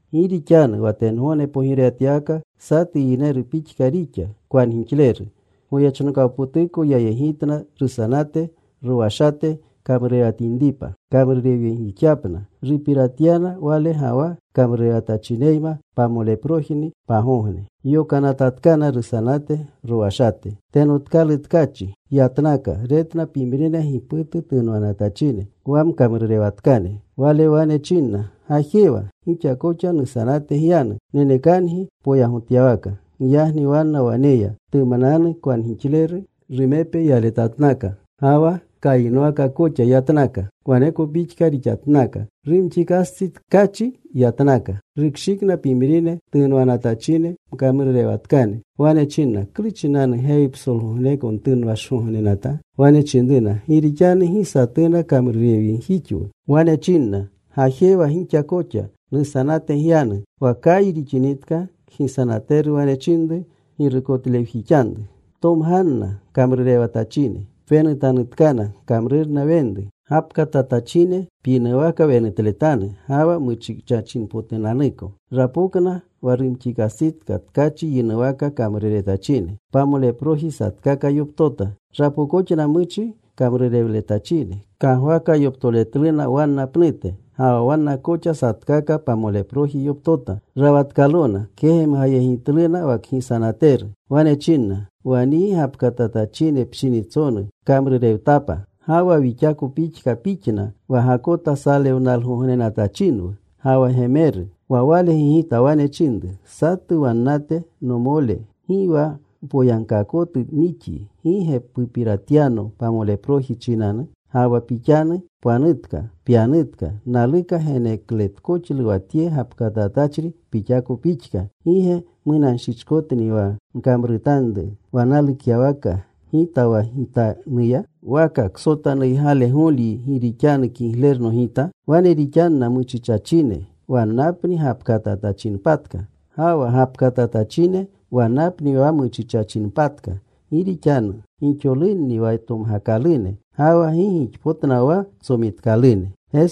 “Gi rixanu wa tengogne pogirewatyawaka satu yineru pixka rixa, kwangixleru. Goyechnokawpotuko yayegitna rusanate rowashate kamrurewatachinepa, kamrurewjixyapna. Rupiratyana wale ga wa kamrurewatachineyma pamoleprojipni pagogne. Yokanatatkana rusanate rowashate. “Tenotkalu tkachi yatnaka. Retna pimrine giputu tunwanatachine, wa mkamrurewatkane. Wale wane chinna, ‘Gajewa. Gixa koxa nusanate gyanu. Nenekangi poyagotyawaka.’ “Giyagni wanna wane ya. Tumananu kwanjixleru rumepe yaletatnaka. Ga wa kayinwaka koxa yatnaka. Waneko pixka rixatnaka. Rumxiikastsi tkachi yatnaka. Rukshikna pimrine tunwanatachine, mkamrurewatkane. Wane chinna, ‘¿Klu chinanu gewi psolgogneko ntunwashgognenata?’ “Wane chinruna, ‘Gi rixanu gi satuna kamrurewjixwu.’ “Wane chinna, ‘Gajewa gixa koxa. Nusanate gyanu.’ “Wa kayi rixinitka kgisanateru wane chinru girukotlewjixanru, ‘Ptomganna kamrurewatachine. Pwenutanutkana kamrurna wenru. Gapkatatachine pyinuwaka wenutletanu, ga wa muchichachinpotunanuko.’ “Rapokna wa rumxiikastsitka tkachi yinuwaka kamruretachine. Pamoleproji satkaka yoptota. Rapookoxna muchi kamrurewletachine. Kagwaka yoptoretluna wanna pnute. Ga wa wanna koxa satkaka pamoleproji yoptota. Rawatkalona. Kegemgayegitluna wa kgisanateru. Wane chinna, ‘Wa nyi gapkatatachine pshinitsonu kamrurewtapna. Ga wa wixako pixka pixna, wa gakota salewnalgognenatachinwu ga wa gemeru.’ “Wa wale gigita. Wane chinru satu wannate, ‘Nomole, gi wa mpoyagkaakotu nixyi. ¿Gi ge pupiratyano pamoleproji chinanu? Ga ga pixanu pwanutka. Pyanutka. Naluka genekletkoxlu wa tye gapkatatachri pixako pixka. ¿Gi ge munanshichkotni wa nkamrutanru wa nalukyawaka gita wa gitanuya? ¿Waka ksotanuygalegolyi gi rixanu kiglerno gita?’ “Wane rixanna muchichachine. Wannapni gapkatatachinpatka. Ga wa gapkatatachine, wannapni wa muchichachinpatka. Gi rixanu gixolunni wa tomgakalune, ga wa gi gixpotna wa tsomitkalune.”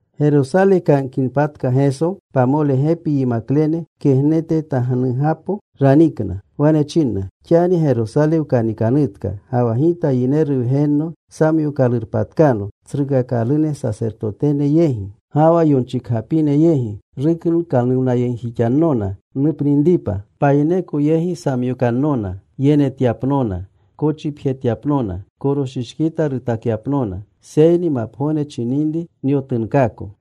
Gerosale kanikinpatka Geso, pamole gepi yimaklene kegnetetamnugapo ranikna. Wane chinna, “Xani Gerosale wkanikanutka, ga wa Gita Yineru Wgenno samyookalurpatkano tsrukakalune sasertotene yegi, ga wa yonchikgapine yegi. Ruklukanuwnayegjixannona nupninripa. Payineko yegi samyokannona yenetyapnona, kochipjetyapnona, koroshishkita rutakyapnona. Seyni mapgogne chininri nyotunkaako.”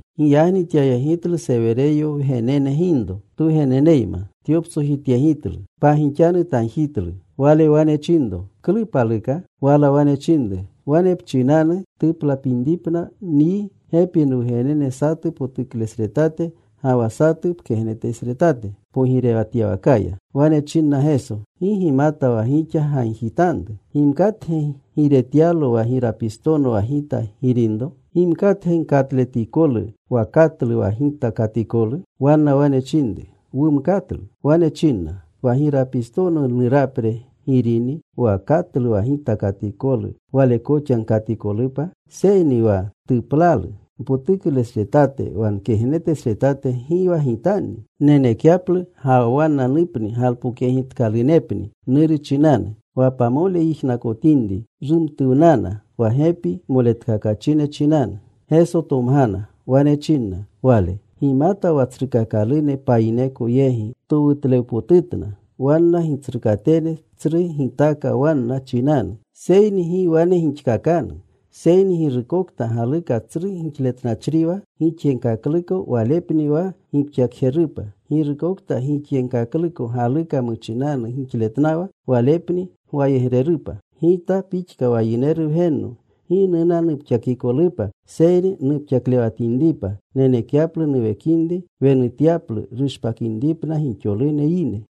Giyagni tyayegitlu Sewereyo wgenene ginro twugeneneyma. Tyoptsojityegitlu. Pagixanu tagjitlu. Wale wane chinro, “¿Klu paluka?” Wala wane chinru, “Wane pchinanu tuplatinripna nyi gepi nwugenene satu potuklesretate ga wa satu pkegnetesretate pogirewatyawakaya.” Wane chinna Geso, “Gi gimata wa gixa gagjitanru. ¿Gimkatge giiretyalo wa girapistono wa Gita girinro? ¿Gimkatge gkatletikolu wa katlu wa Gita katikolu?” Wanna wane chinru, “Wumkatlu.” Wane chinna, “Wa girapistono nurapre girini. Wa katlu wa Gita katikolu wale koxa gkatikolupa. Seyni wa tuplalu npotuklesretate, wa nkegnetesretate gi wa Gitanni nenekyaplu, ga wa wannanupni galpokyegitkalunepni Nuru chinanu.” Wa pamole yijnakotinri, rumtuwnana wa gepi moletkakachine chinanu. Geso tomgana. Wane chinna Wale, “Gimata wa tsrukakalune payineko yegi towutlewpotutna. Wanna gitsrukatene tsru gitaaka wanna chinanu. Seyni gi wane gixkakanu, seyni girukokta galuka tsru gixletnachriwa gixyegkakluko walepni wa gipxakjerupa. Girukokta gixyegkakluko galuka muchinanu gixletnawa, walepni gwayegrerupa. Gita pixka wa Yineru Wgenno gi nuna nupxakikolupa, seyni nupxaklewatinripa, nenekyaplu nuwekinri nwenutyaplu ruspakinripna gixolune yine.”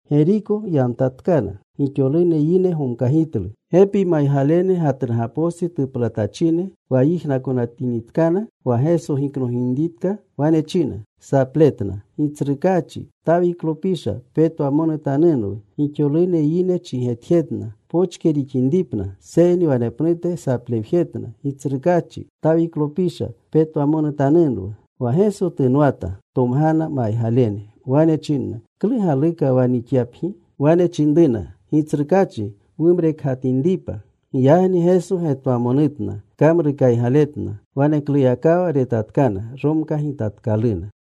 Geriko yamtyatkana. Gixolune yine gomkagitlu. Gepi maygalene gatnugapostsi tuplatachine, wa yijnakotinitkana wa Geso giknoginritka, wane china sapletna, “Gitsrukaachi, Tawiklopisha, petwamonutanunwu.” Gixolune yine chigetjetna pochke rixinripna, seyni wanepnute saplewjetna, “Gitsrukaachi Tawiklopisha, petwamonutanunwu.” Wa Geso tunwata. Tomgana maygalene. Wane chinna, “¿Klu galukatka wa nixyapgi?” Wane chinruna, “Gitsrukachi, Wumrekgatinripa.” Giyagni Geso getwamonutna. Kamrukaygaletna. Wanekluyakawa retatkana. Romkagitatkaluna.